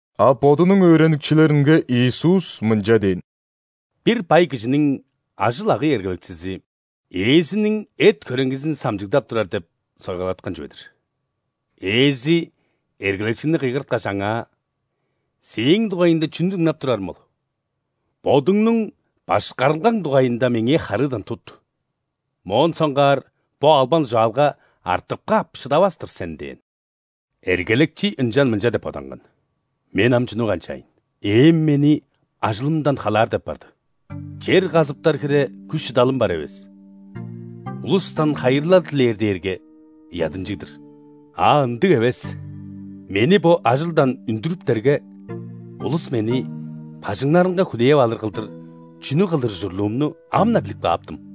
А Бодунуң өөреникчилеринге Иисус мынча дээн: «Бир бай кижиниң ажыл-агый эргелекчизи ээзиниң эт-хөреңгизин самчыгдап турар деп сойгалаткан чүве-дир. Ээзи эргелекчини кыйгырткаш, аңаа: „Сээң дугайыңда чүнү дыңнап турарым ол? Бодуңнуң башкарылгаң дугайында меңээ харыыдан тут, моон соңгаар бо албан-дужаалга артып каап шыдавас-тыр сен“ – дээн. Эргелекчи ынчан мынча деп боданган: „Мен ам чүнү канчаайн? Ээм мени ажылымдан халаар деп барды. Чер казыптар хире күш-шыдалым бар эвес, улустан хайырлал дилээр дээрге, ыядынчыг-дыр. А, ындыг эвес, мени бо ажылдан үндүрүптерге, улус мени бажыңнарынга хүлээп алыр кылдыр чүнү кылыр ужурлуумну ам-на билип кааптым!“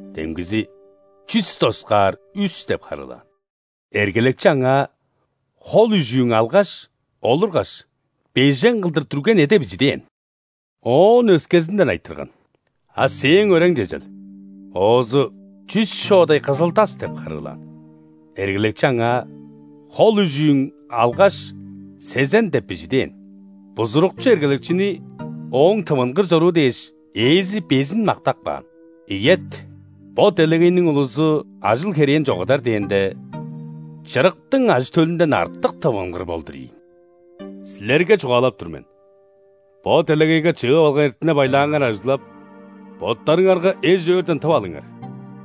Демгизи: „Чүс доскаар үс“ – деп харыылаан. Эргелекчи аңаа: „Хол үжүүң алгаш, олургаш, бежен кылдыр дүрген эде бижи“ – дээн. Оон өскезинден айтырган: „А сээң өрең чежел?“ Оозу: „Чүс шоодай кызыл-тас“ – деп харыылаан. Эргелекчи аңаа: „Хол үжүүң алгаш, сезен деп бижи“ – дээн. Бузурукчу эргелекчини, ооң тывынгыр чоруу дээш, ээзи безин мактап каан. Ийет, бо делегейниң улузу ажыл-херээн чогудар дээнде, чырыктың ажы-төлүнден артык тывынгыр болдур ийин. Силерге чугаалап тур мен: бо делегейге чыып алган эртине-байлааңар ажыглап, боттарыңарга эш-өөрден тып алыңар,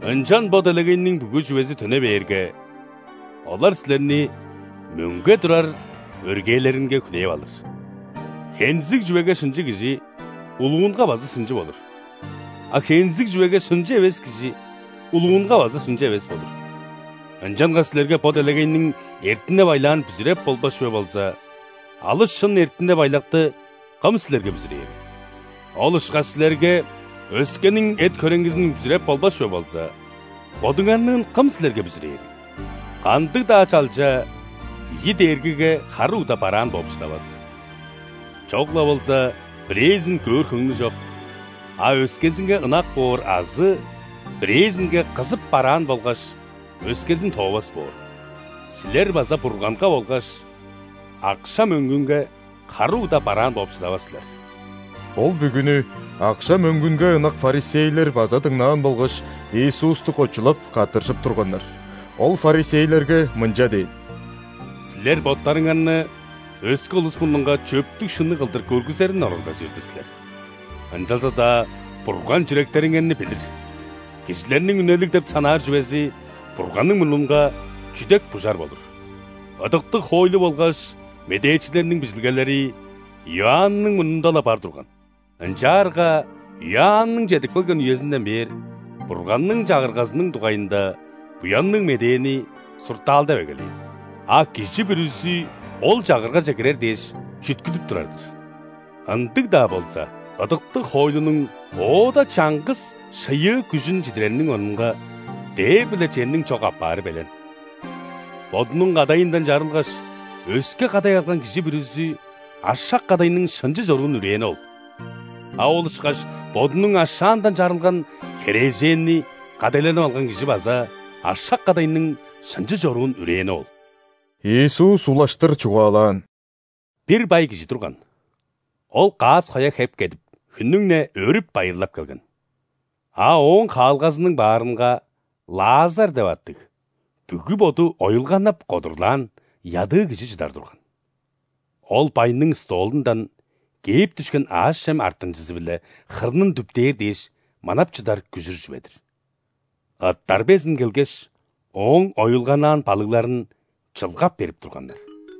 ынчан бо делегейниң бүгү чүвези төне бээрге, олар силерни мөңге турар өргээлеринге хүлээп алыр. Хензиг чүвеге шынчы кижи улуунга база шынчы болур, а хензиг чүвеге шынчы эвес кижи улуунга база шынчы эвес болур. Ынчангаш силерге бо делегейниң эртине-байлаан бүзүреп болбас чүве болза, алыс шын эртине-байлакты кым силерге бүзүрээрил? Ол ышкаш силерге өскениң эт-хөреңгизин бүзүреп болбас чүве болза, бодуңарныын кым силерге бүзүрээрил? Кандыг-даа чалча ийи дээргиге хары угда бараан бооп шыдавас: чок-ла болза бирээзин көөр хөңнү чок, а өскезинге ынак боор азы бирээзинге кызып бараан болгаш, өскезин тоовас боор. Силер база Бурганга болгаш акша-мөңгүнге хары угда бараан болуп шыдавас силер». Ол бүгүнү акша-мөңгүнге ынак ·фарисейлер база дыңнаан болгаш, Иисусту кочулап, каттыржып турганнар. Ол фарисейлерге мынча дээн: «Силер боттарыңарны өске улус мурнунга чөптүг-шынныг кылдыр көргүзерин оралдажыр-дыр силер, ынчалза-даа Бурган чүректериңерни билир. Кижилерниң үнелиг деп санаар чүвези Бурганның мурнунга чүдек-бужар болур. Ыдыктыг хоойлу болгаш медээчилерниң Бижилгелери Иоанның мурнунда-ла бар турган. Ынчаарга Иоанның чедип келген үезинден бээр, Бурганның Чагыргазының дугайында Буянныг Медээни суртаалдап эгелээн, а кижи бүрүзү ол Чагыргаже кирер дээш, чүткүдүп турар-дыр. Ындыг-даа болза, ыдыктыг хоойлунуң оода чаңгыс шыйыы күжүн чидирериниң орнунга, дээр биле черниң чок апаары белен! Бодунуң кадайындан чарылгаш, өске кадай алган кижи бүрүзү ашак-кадайның шынчы чоруун үрээни ол. А ол ышкаш бодунуң ашаандан чарылган херээженни кадайланып алган кижи база ашак-кадайның шынчы чоруун үрээни ол». Иисус улаштыр чугаалаан: «Бир бай кижи турган, ол каас-коя хеп кедип, хүннүң-не өөрүп-байырлап келген. А ооң хаалгазының баарынга Лазар деп аттыг, бүгү боду оюлганнап кодурлаан ядыы кижи чыдар турган. Ол байның столундан кээп дүшкен аъш-чем артынчызы-биле хырнын дүптээр дээш манап чыдар күжүр чүве-дир. Ыттар безин келгеш, ооң оюлганнаан балыгларын чылгап берип турганнар.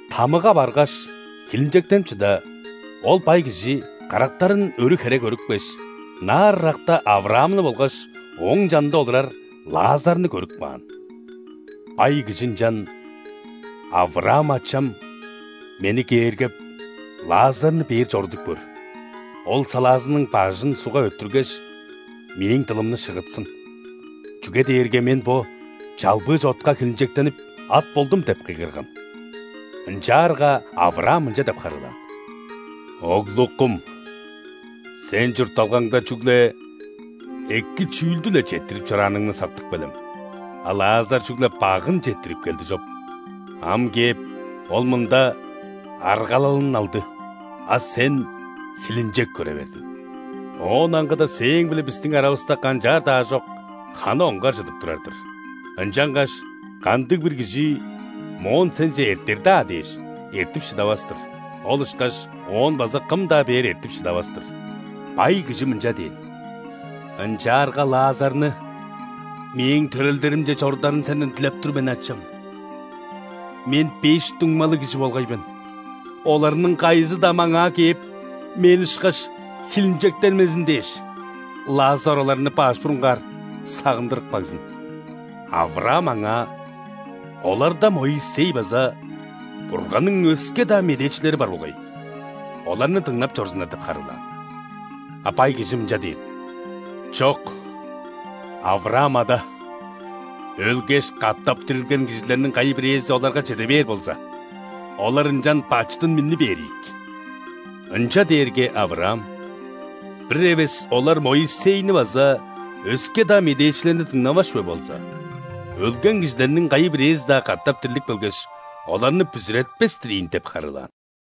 ·Тамыга баргаш, хилинчектенип чыда, ол бай кижи карактарын өрү хере көрүпкеш, ынаар ыракта Авраамны болгаш ооң чанында олурар Лазарны көрүп каан. Бай кижи ынчан: „Авраам, ачам, мени кээргеп, Лазарны бээр чорудуп көр. Ол салаазының бажын ·сугга өттүргеш, мээң дылымны шыгытсын. Чүге дээрге мен бо чалбыыш-отка хилинчектенип, ат болдум“ – деп кыйгырган. Ынчаарга Авраам мынча деп харыылаан: „Оглукум, сен чуртталгаңда чүгле эки чүүлдү-ле четтирип чорааныңны сактып келем, а Лазар чүгле багын четтирип келди чоп. Ам кээп, ол мында аргалалын алды, а сен хилинчек көре бердиң. Оон аңгыда сээң-биле бистиң аравыста канчаар-даа аажок ханы оңгар чыдып турар-дыр, ынчангаш кандыг-бир кижи моон сенче эртер-даа дээш, эртип шыдавас-тыр, ол ышкаш оон база кым-даа бээр эртип шыдавас-тыр“. Бай кижи мынча дээн: „Ынчаарга Лазарны мээң төрелдеримче чорударын сенден дилеп тур мен, ачам. Мен беш дуңмалыг кижи болгай мен, оларның кайызы-даа маңаа кээп, мен ышкаш хилинчектенмезин дээш, Лазар оларны баш бурунгаар сагындырып кагзын“. Авраам аңаа: „Оларда Моисей база Бурганның өске-даа медээчилери бар болгай, оларны дыңнап чорзуннар“ – деп харыылаан. А бай кижи мынча дээн: „Чок, Авраам ада, өлгеш, катап дирилген кижилерниң кайы-бирээзи оларга чеде бээр болза, олар ынчан бачыдын минни бээр ийик“. Ынча дээрге, Авраам: „Бир эвес олар Моисейни база өске-даа медээчилерни дыңнавас чүве болза, өлген кижилерниң кайы-бирээзи-даа катап дирлип келгеш, оларны бүзүретпес-тир ийин“ – деп харыылаан».